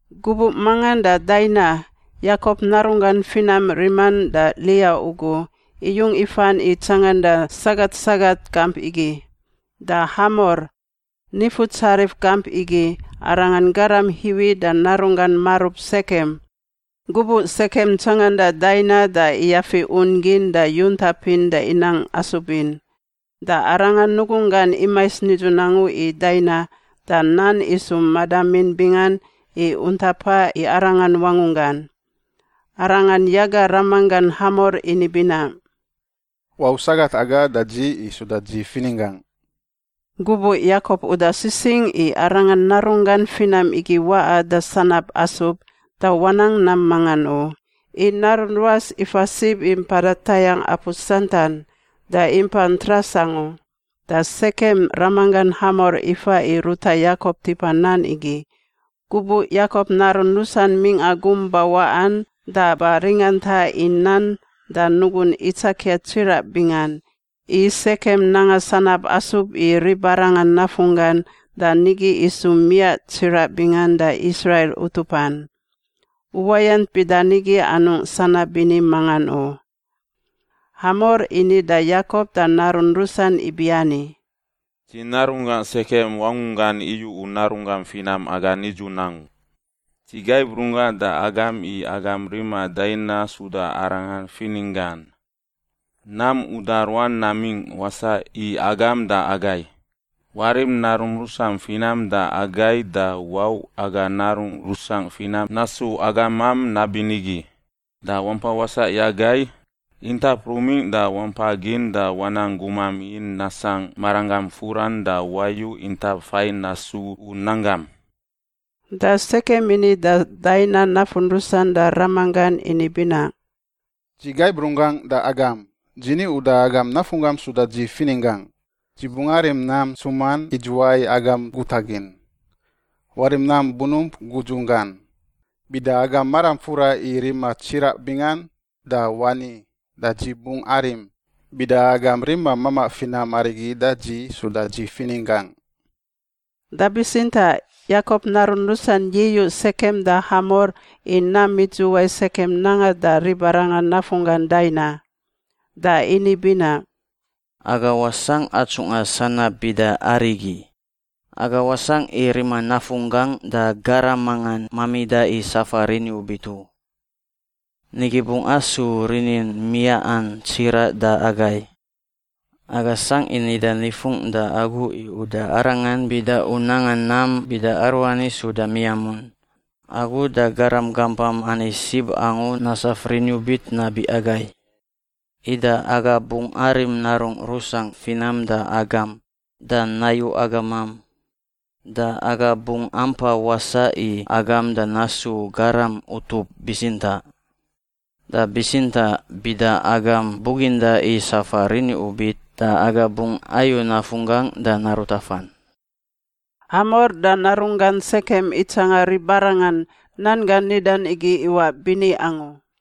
Gubuꞌ mangan da Daina, Yakop narunggan finam riman da Lia ugu, iyung ifan i tsanganda sagat sagat gamp igi. Da Hamor, nifutsarif gamp igi, aranga garam Hiwi da narunggan marub Sekem. Gubuꞌ Sekem tsanganda Daina da iyafi un gin da yuntapin da inang asub in. Da arangan nugunggan imais nidzun angu i Daina da nan isu madamin bingan i untapa i arangan wangunggan. Arangan yaga ramanggan Hamor ini binaꞌ, “Wau sagat aga da dzi i suda dzi fininggangꞌ.” Gubuꞌ Yakop uda sisingꞌ i arangan narunggan finam igi waꞌa da sanab asub, da wanang nam mangan u, i narun ruas ifa sib i mpada tayangꞌ apu santan, da impa ntras angu. Da Sekem ramanggan Hamor ifa i ruta Yakop tipa nan igi. Gubuꞌ Yakop narun rusan mingꞌa gum bawaꞌan da ba ringanta i nan da nugun itsakia tsiraꞌ bingan, i Sekem nanga sanab asub i ribarangan nafunggan da nigi isu miaꞌ tsiraꞌ bingan da Israil utupan. Uwayant bida nigi anungꞌ sanab bini mangan u. Hamor ini da Yakop da narun rusan ibiani, “Dzi narunggan Sekem wangungan iyu u narunggam finam aga nidzun angu. Dzi gaib runggangꞌ da agam i agam rima Daina suda arangan fininggan. Nam uda ruan namingꞌ wasaꞌ i agam da agai; warim narum rusam finam da agai da wau aga narungꞌ rusangꞌ finam nasu agamam nabinigi. Da wampa wasaꞌ i agai; intap rumingꞌ da wampa gin da wanang gumam in nasangꞌ maranggam furan da wayu intap fain nasu u nanggam.” Da Sekem ini da Daina nafun rusan da ramanggan ini binaꞌ, “Dzi gaib runggangꞌ da agam; dzi ni uda agam nafunggam suda dzi fininggangꞌ. Dzi bungꞌ arim nam ntsuman idzuwai agam gutagin. Warim nam bunump gudzunggan. Bida agam maram fura i rima tsiraꞌ bingan, da wani, da dzi bungꞌ arim, bida agam rima mamaꞌ finam arigi da dzi suda dzi fininggangꞌ.” Da bitsintaꞌ Yakop narun rusan yi-iyuꞌ Sekem da Hamor i nam idzuwai Sekem nanga da ribarangan nafunggan Daina. Da ini binaꞌ, “Aga wasangꞌ atsunga sanab bida arigi. Aga wasangꞌ i rima nafunggangꞌ da garam mangan mamida i safa riniubit u. Nigi bungꞌ asu rinin miaꞌan tsiraꞌ da agai. Aga sangꞌ i nida nifungꞌ da agu i uda arangan bida u nanga nam bida aruani suda miamun: agu da garam gampam ani sib angu nasaf riniubit nabi agai. Ida aga bungꞌ arim narungꞌ rusangꞌ finam da agam, da nayu agamam. Da aga bungꞌ ampa wasaꞌ i agam da nasu garam utup bitsintaꞌ. Da bitsintaꞌ bida agam buginda i safa riniubit, da aga bungꞌ ayu nafunggangꞌ da narut afan.” Hamor da narunggan Sekem itsanga ribarangan nan gan nidan igi iwaꞌ bini angu.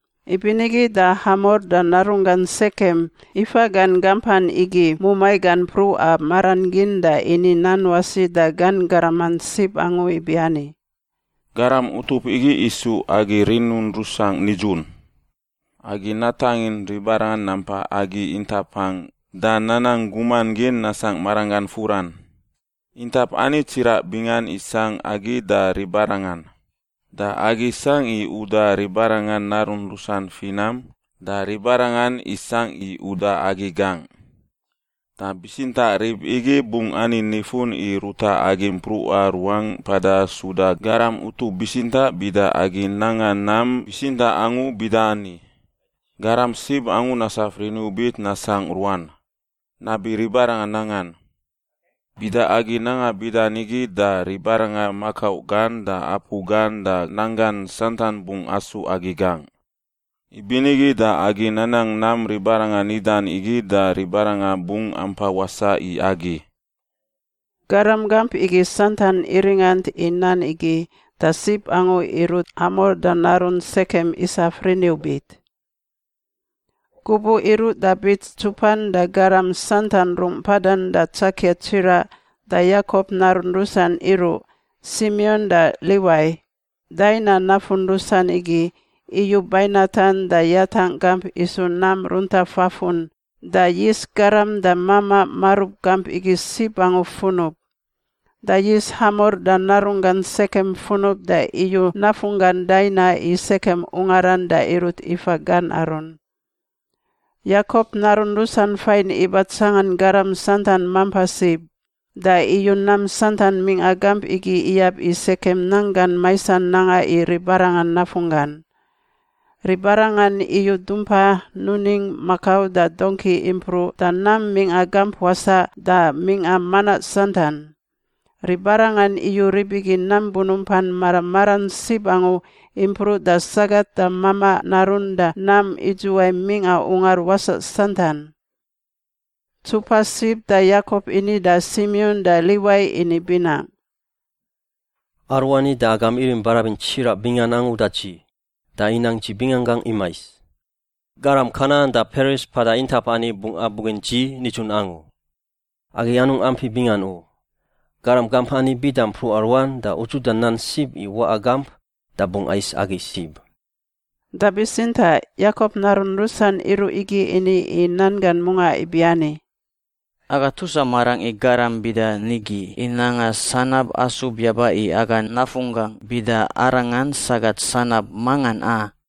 Ibinigi da Hamor da narunggan Sekem ifa gan gampan igi mumai gan mpruꞌa maran gin da ini nan wasi da gan garaman sib angu ibiani, “Garam utup igi isu agi rinungꞌ rusangꞌ nidzun. Agi natangin ribarangan nampa agi intapangꞌ da nanang guman gin nasangꞌ maranggan furan. Intap ani tsiraꞌ bingan isangꞌ agi da ribarangan. Da agi sangꞌ i uda ribarangan narun rusan finam da ribarangan isangꞌ i uda agi gangꞌ. Da bitsintaꞌ rib igi bungꞌ ani nifun i ruta agi mpruꞌa ruangꞌ mpada suda garam utup bitsintaꞌ bida agi nanga nam bitsintaꞌ angu bida ani: garam sib angu nasaf riniubit nasangꞌ ruan, nabi ribarangan nangan. Bida agi nanga bida nigi da ribarangan makau gan da apu gan da nanggan santan bungꞌ asu agi gangꞌ. Ibinigi da agi nanang nam ribarangan nidan igi da ribarangan bungꞌ ampa wasaꞌ i agi.” Garam gamp igi santan iringant i nan igi, da sib angu irut Hamor da narun Sekem isaf riniubit. Gubuꞌ iruꞌ da bits ntsupan da garam santan rungꞌ mpadan da tsakia tsiraꞌ da Yakop narun rusan iruꞌ, Simion da Liwai, Daina nafun rusan igi, iyu bainatan da yatangꞌ gamp isu nam runta fafun da yis garam da mamaꞌ marub gamp igi sib angu funub. Da yis Hamor da narunggan Sekem funub da iyu nafunggan Daina i Sekem ungaran da irut ifa gan arun. Yakop narun rusan fain iba tsangan garam santan mampa sib da iyu nam santan mingꞌa gamp igi iyab i Sekem nanggan maisan nanga i ribarangan nafunggan. Ribarangan iyu dumpa, nuning, makau da dongki impruꞌ da nam mingꞌa gamp wasaꞌ da mingꞌa manaꞌ santan. Ribarangan iyu rib igi nam bunumpan mara maran sib angu impruꞌ da sagat da mamaꞌ narun da nam idzuwai mingꞌa ungar wasaꞌ santan. Ntsupa sib da Yakop ini da Simion da Liwai ini binaꞌ, “Aruani da agam irim barabin tsiraꞌ bingan angu da dzi, da inang dzi binganggangꞌ imais. Garam Kanan da Peris mpada intap ani bungꞌ abugin dzi nidzun angu. Agi anungꞌ ampi bingan u. Garam gamp ani bida mpruꞌa ruan da udzuda nan sib i waꞌa gamp da bungꞌ ais agi sib.” Da bitsintaꞌ Yakop narun rusan iruꞌ igi ini i nan gan mungaꞌ ibiani, “Aga tusa marangꞌ i garam bida nigi i nanga sanab asub yaba i aga nafunggangꞌ bida arangan sagat sanab mangan, a?”